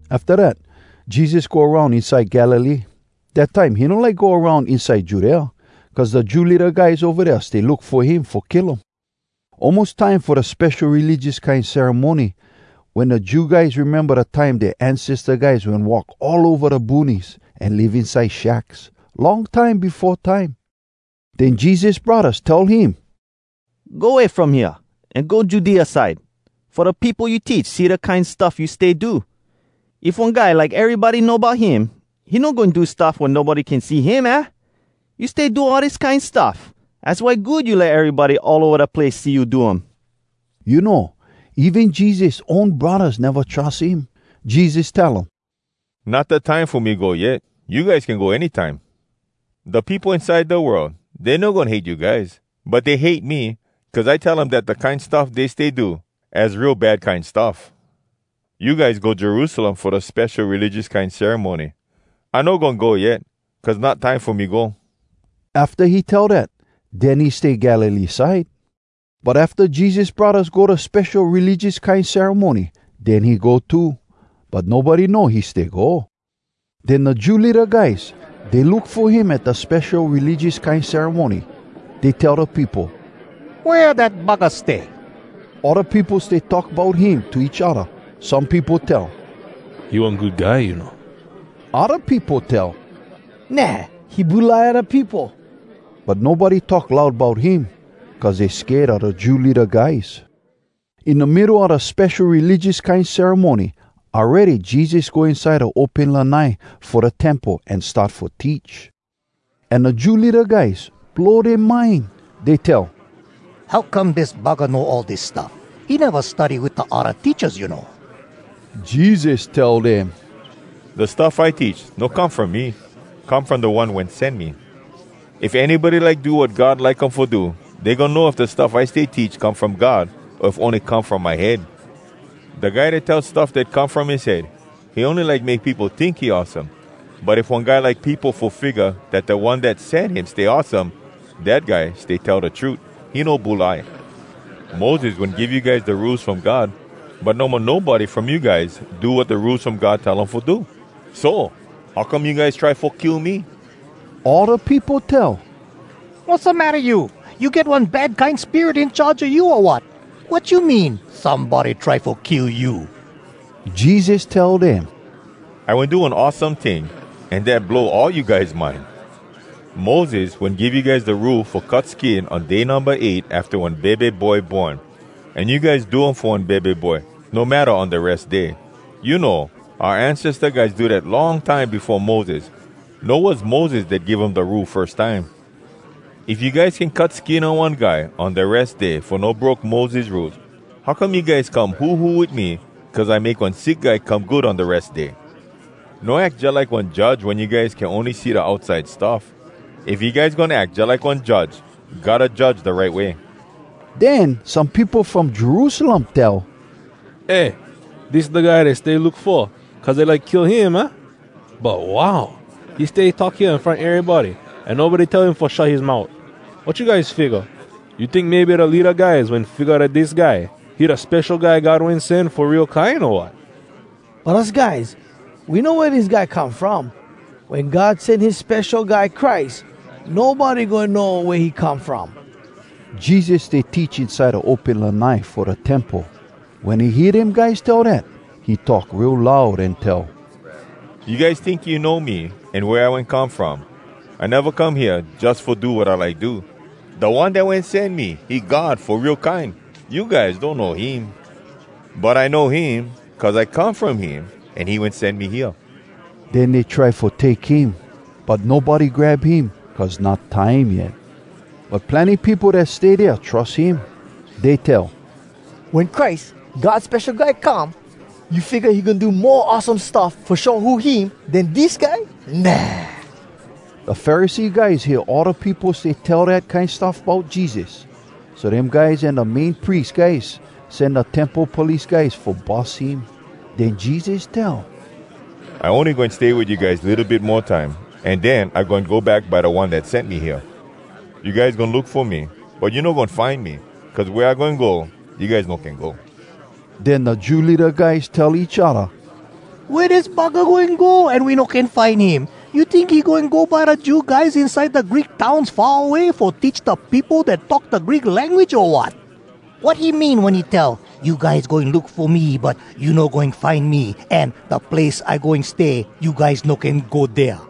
Afta dat, Jesus go aroun inside Galilee. Dat time he no like go aroun inside Judea, cuz da Jew leada guys ova dea stay look fo him fo kill um. Almos time fo da spesho religious kine ceremony wen da Jew guys rememba da time dea ancesta guys wen walk all ova da boonies an live inside shacks, long time befo time. Den Jesus braddahs tell him, “Go way from hea, an go Judea side, fo da peopo you teach see da kine stuff you stay do. If one guy like erybody know bout him, he no goin do stuff wea nobody can see him, aah? You stay do all dis kine stuff, az why good you let erybody all ova da place see you do um!” You know, even Jesus own braddahs neva trus him. Jesus tell um, “Not da time fo me go yet. You guys can go any time. Da peopo inside da world, dey no goin hate you guys. But dey hate me, cuz I tell um dat da kine stuff dey stay do, az real bad kine stuff! You guys go Jerusalem fo da spesho religious kine ceremony. I no goin go yet, cuz not time fo me go.” Afta he tell dat, den he stay Galilee side. But afta Jesus braddahs go da spesho religious kine ceremony, den he go too. But nobody know he stay go. Den da Jew leada guys, dey look fo him at da spesho religious kine ceremony. Dey tell da peopo, “Wea dat buggah stay?” All da peopo stay talk bout him to each odda. Some peopo tell, “He one good guy, you know.” Odda peopo tell, “Nah! He bulai da peopo.” But nobody talk loud bout him, cuz dey sked a da Jew leada guys. In da middo a da spesho religious kine ceremony awready Jesus go inside da open lanai fo da Temple an start fo teach. An da Jew leada guys, blow dea mind. Dey tell, “How come dis buggah know all dis stuff? He neva study wit da odda teachas, you know.” Jesus tell dem, “Da stuff I teach, no come from me. Come from da One wen sen me. If anybody like do wat God like um fo do, dey goin know if da stuff I stay teach come from God, o if ony come from my head. Da guy dat tell stuff dat come from his head, he ony like make peopo tink he awesome. But if one guy like peopo fo figga dat da one dat sen him stay awesome, dat guy stay tell da trut. He no bulai. Moses wen give you guys da Rules From God, but no mo nobody from you guys do wat da Rules From God tell um fo do. So, how come you guys try fo kill me?” All da peopo tell, “Wassamatta you? You get one bad kine spirit in charge a you, o wat? Wat you mean, somebody try fo kill you?” Jesus tell dem, “I wen do one awesome ting, an dat blow all you guys mind. Moses wen give you guys da Rule fo cut skin on day numba eight afta one bebe boy born, an you guys do um fo one bebe boy, no matta on da Res Day. You know, oua ancesta guys do dat long time befo Moses. No was Moses dat give um da Rule firs time. If you guys can cut skin on one guy on da Res Day fo no broke Moses Rules, how come you guys come huhu wit me cuz I make one sick guy come good on da Res Day? No ack jalike one judge wen you guys can see ony da outside stuff. If you guys goin ack jalike one judge, gotta judge da right way.” Den some peopo from Jerusalem tell, “Eh! Dis da guy dey stay look fo, cuz dey like kill um, aah? But, wow! He stay talk hea in front erybody, an nobody tell him fo shut his mout. Wat you guys figga? You tink maybe da leada guys wen figga dat dis guy, he da Spesho Guy God Goin Sen, fo real kine, o wat?! But us guys, we know wea dis guy come from. Wen God sen his Spesho Guy Christ, nobody goin know wea he come from.” Jesus stay teach inside da open lanai fo da Temple. Wen he hear dem guys tell dat, he talk real loud an tell, “You guys tink you know me, an wea I wen come from? I neva come hea jus fo do wat I like do. Da One dat wen sen me, he God fo real kine! You guys donno him. But I know him, cuz I come from him, an he wen sen me hea.” Den dey try fo take him, but nobody grab him, cuz not time yet. But plenny peopo dat stay dea trus him. Dey tell, “Wen Christ, God Spesho Guy, come, you figga he goin do mo awesome stuff fo show who him den dis guy? Nah!” Da Pharisee guys hear all da peopo stay tell dat kine stuff bout Jesus. So dem guys an da Main Pries guys sen da Temple Police guys fo bus him. Den Jesus tell, “I ony goin stay wit you guys litto bit mo time, an den I goin go back by da One dat sen me hea. You guys goin look fo me, but you no goin find me, cuz wea I goin go, you guys no can go.” Den da Jew leada guys tell each odda, “Wea dis buggah goin go, an we no can find him? You tink he goin go by da Jew guys inside da Greek towns far away, fo teach da peopo dat talk da Greek language, o wat? Wat he mean wen he tell, ‘You guys goin look fo me, but you no goin find me,’ an ‘Da place I goin stay, you guys no can go dea’?”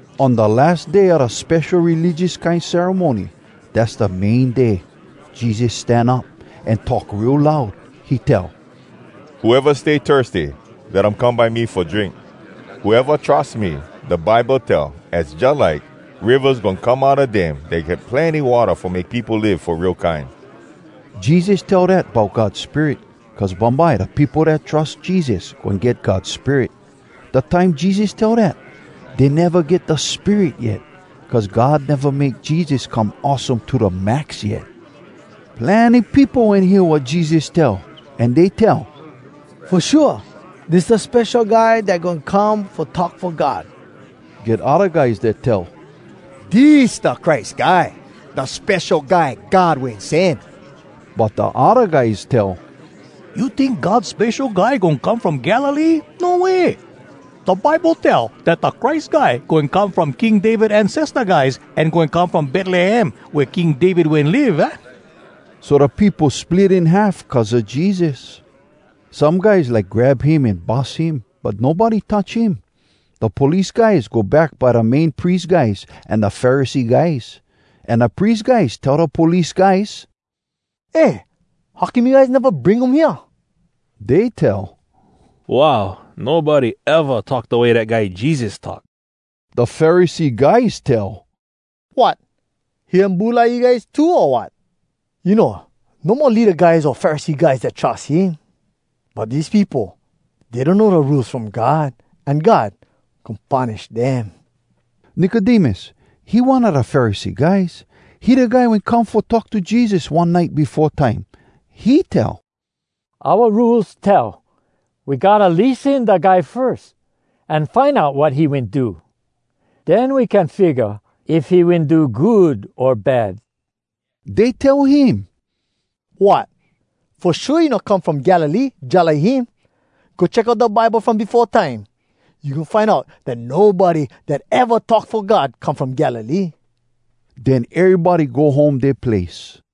On da las day a da spesho religious kine ceremony, dass da main day, Jesus stan up, an talk real loud. He tell, “Whoeva stay thirsty, let um come by me fo drink. Whoeva trus me, da Bible tell az jalike ‘rivas goin come outa dem dat get plenny watta fo make peopo live fo real kine.’” Jesus tell dat bout God Spirit, cuz bumbye da peopo dat trus Jesus goin get God Spirit. Da time Jesus tell dat, dey neva get da Spirit yet, cuz God neva make Jesus come awesome to da max yet. Plenny peopo wen hear wat Jesus tell. An dey tell, “Fo shua, dis da Spesho Guy dat goin come fo talk fo God!” Get odda guys dat tell, “Dis da Christ Guy, da Spesho Guy God Wen Sen!” But da odda guys tell, “You tink God Spesho Guy goin come from Galilee? No way! Da Bible tell dat da Christ Guy goin come from King David ancesta guys, an goin come from Betlehem, wea King David wen live, aah?” So da peopo split in half cuz a Jesus. Some guys like grab him an bus him, but nobody touch him. Da police guys go back by da Main Pries guys an da Pharisee guys. An da pries guys tell da police guys, “Eh! How come you guys neva bring him hea?” Dey tell, “Wow! Nobody eva talk da way dat guy Jesus talk!” Da Pharisee guys tell, “Wot! He wen bulai you guys too, o wat?! You know, no mo leada guys o Pharisee guys dat trus him. But dis peopo, dey donno da Rules From God, an God goin punish dem!” Nicodemus, he one a da Pharisee guys. He da guy wen come fo talk to Jesus one nite befo time. He tell, “Oua Rules tell, we gotta lissen da guy firs, an find out wat he wen do. Den we can figga if he wen do good o bad.” Dey tell him, “Wot! Fo shua you no come from Galilee jalike him! Go check out da Bible from befo time. You goin find out dat nobody dat eva talk fo God come from Galilee!” Den erybody go home dea place.